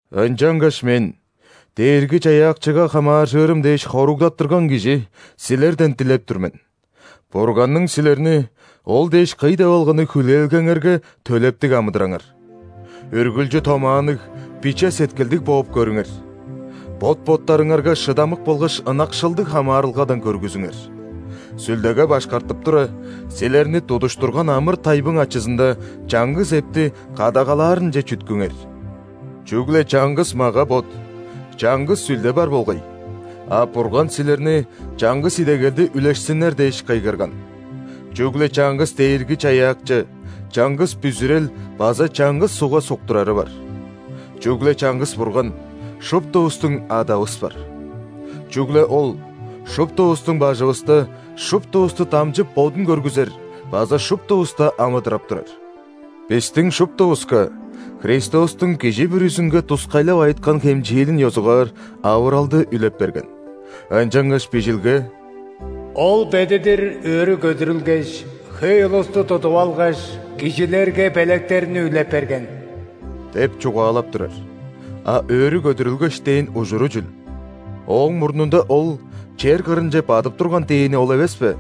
Ынчангаш мен, Дээрги-Чаяакчыга хамааржырым дээш хоругдаттырган кижи, силерден дилеп тур мен: Бурганның силерни ол дээш кый деп алганы хүлээлгеңерге төлептиг амыдыраңар. Үргүлчү томаанныг, биче сеткилдиг бооп көрүңер. Бот-боттарыңарга шыдамык болгаш ынакшылдыг хамаарылгадан көргүзүңер. Сүлдеге башкартып тура, силерни тудуштурган амыр-тайбың ачызында чаңгыс эпти кадагалаарынче чүткүңер. Чүгле чаңгыс мага-бот, чаңгыс Сүлде бар болгай, а Бурган силерни чаңгыс идегелди үлешсиннер дээш кыйгырган. Чүгле чаңгыс Дээрги-Чаяакчы, чаңгыс бүзүрел база чаңгыс ·сугга суктурары бар. Чүгле чаңгыс Бурган, шуптувустуң Адавыс бар. Чүгле Ол – шуптувустуң бажывыста, шуптувусту дамчып Бодун көргүзер база шуптувуста амыдырап турар. Бистиң шуптувуска, Христостуң кижи бүрүзүнге тускайлап айыткан хемчээлин ёзугаар, авыралды үлеп берген. Ынчангаш Бижилге:«Ол бедидир өрү көдүрүлгеш, хөй улусту тудуп алгаш,кижилерге белектерни үлеп берген» – деп чугаалап турар. А «өрү көдүрүлгеш» дээн ужуру чүл? Ооң мурнунда Ол чер кырынче бадып турган дээни ол эвес бе?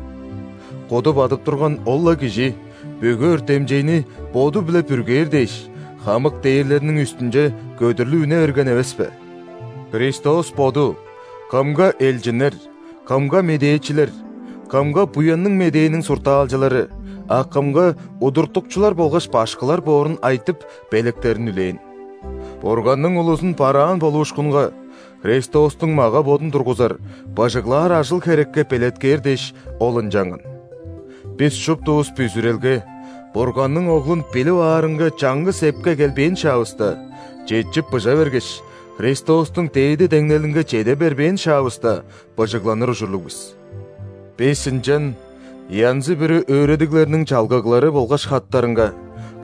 Куду бадып турган ол-ла Кижи, бүгү өртемчейни Боду-биле бүргээр дээш, хамык дээрлерниң үстүнче көдүрлүп үне берген эвес бе? Христос Боду кымга – элчиннер, кымга – медээчилер, кымга – Буянныг Медээниң суртаалчылары, а кымга – удуртукчулар болгаш башкылар боорун айтып, белектерин үлээн. Бурганның улузун бараан болуушкунга, Христостуң мага-бодун тургузар, быжыглаар ажыл-херекке белеткээр дээш, Ол ынчанган. Бис шуптувус бүзүрелге, Бурганның Оглун билип аарынга чаңгыс эпке келбээн шаавыста; четчип-быжа бергеш, Христостуң дээди деңнелинге чеде бербээн шаавыста, быжыгланыр ужурлуг бис. Бис ынчан янзы-бүрү өөредиглерниң чалгыглары болгаш хаттарынга,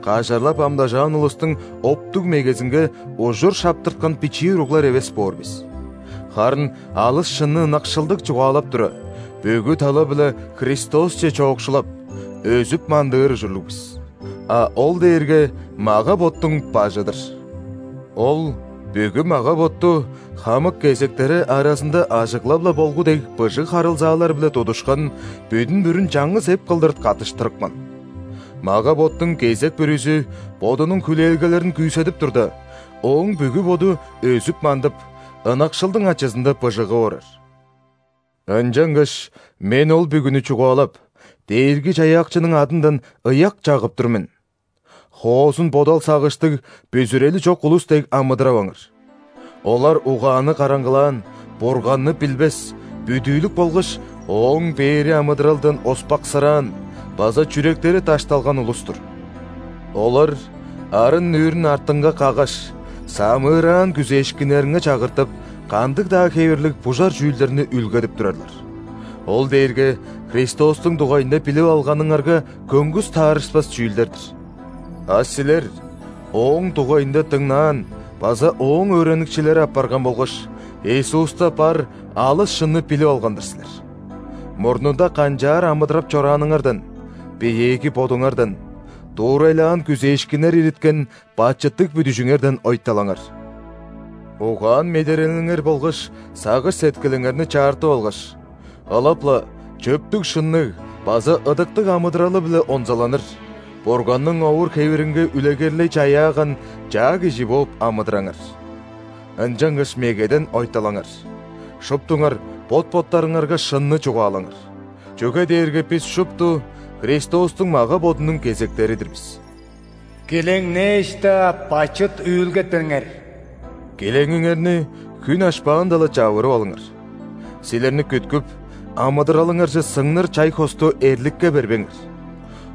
кажарлап амдажаан улустуң оптуг мегезинге ужур шаптырткан бичии уруглар эвес боор бис. Харын алыс шынны ынакшылдыг чугаалап тура, бүгү тала-биле Христосче чоокшулап, өзүп-мандыыр ужурлуг бис. А Ол дээрге – мага-боттуң Бажы-дыр. Ол бүгү мага-ботту хамык кезектери аразында ажыглап-ла болгу дег быжыг харылзаалар-биле тудушкан бүдүн-бүрүн чаңгыс эп кылдыр каттыштырыпкан. Мага-боттуң кезек бүрүзү бодунуң хүлээлгелерин күүседип турда, ооң бүгү боду өзүп-мандып, ынакшылдың ачызында быжыгып орар. Ынчангаш мен ол бүгүнү чугаалап, Дээрги-Чаяакчының адындан ыяк чагып тур мен: хоозун бодал-сагыштыг бүзүрели чок улус дег амыдыраваңар. Олар угааны караңгылаан, Бурганны билбес, бүдүүлүк болгаш, Ооң бээри амыдыралдан оспаксыраан база чүректери дашталган улус-тур. Олар арын-нүүрүн артынга каггаш, самыыраан күзээшкиннеринге чагыртып, кандыг-даа хевирлиг бужар чүүлдерни үүлгедип турарлар. Ол дээрге Христостуң дугайында билип алганыңарга көңгүс таарышпас чүүлдер-дир. А силер Ооң дугайында дыңнаан база Ооң өөреникчилери апарган болгаш, Иисуста бар алыс шынны билип алган-дыр силер. Мурнунда канчаар амыдырап чорааныңардан – биеэги бодуңардан, дуурайлаан күзээшкиннер ириткен бачыттыг бүдүжүңерден ойталаңар. Угаан-медерелиңер болгаш сагыш-сеткилиңерни чаартып алгаш, ылап-ла чөптүг-шынныг база ыдыктыг амыдыралы-биле онзаланыр, Бурганның овур-хевиринге үлегерлей чаяаган чаа кижи бооп амыдыраңар. Ынчангаш мегеден ойталаңар, шуптуңар бот-боттарыңарга шынны чугаалаңар, чүге дээрге бис шупту Христостуң мага-бодунуң кезектери-дир бис. Килеңнээш-даа, бачыт үүлгетпеңер. Килеңиңерни хүн ашпаанда-ла чавырып алыңар; силерни күткүп, амыдыралыңарже сыңныр чай-хосту эрликке бербеңер!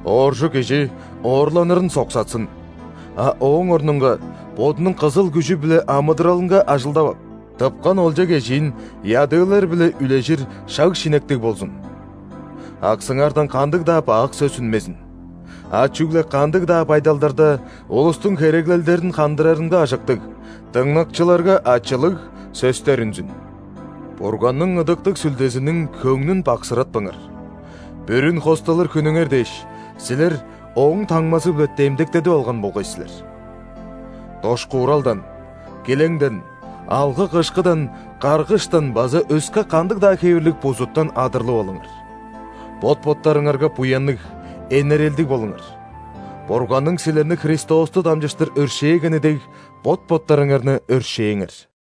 Ооржу кижи оорланырын соксатсын, а ооң орнунга бодунуң кызыл күжү-биле амыдыралынга ажылдап ап, тыпкан олча-кежиин ядыылар-биле үлежир шаг-шинектиг болзун. Аксыңардан кандыг-даа бак сөс үнмезин, а чүгле кандыг-даа байдалдарда улустуң хереглелдерин хандырарынга ажыктыг, дыңнакчыларга ачылыг сөстер үнзүн. Бурганның Ыдыктыг Сүлдезиниң хөңнүн баксыратпаңар. Бүрүн хосталыр хүнүңер дээш, силер Ооң таңмазы-биле демдектедип алган болгай силер. Дошкууралдан, килеңден, алгы-кышкыдан, каргыштан база өске кандыг-даа хевирлиг бузуттан адырлып алыңар. Бот-боттарыңарга буянныг, энерелдиг болуңар, Бурганның силерни Христосту дамчыштыр өршээгени дег, бот-боттарыңарны өршээңер.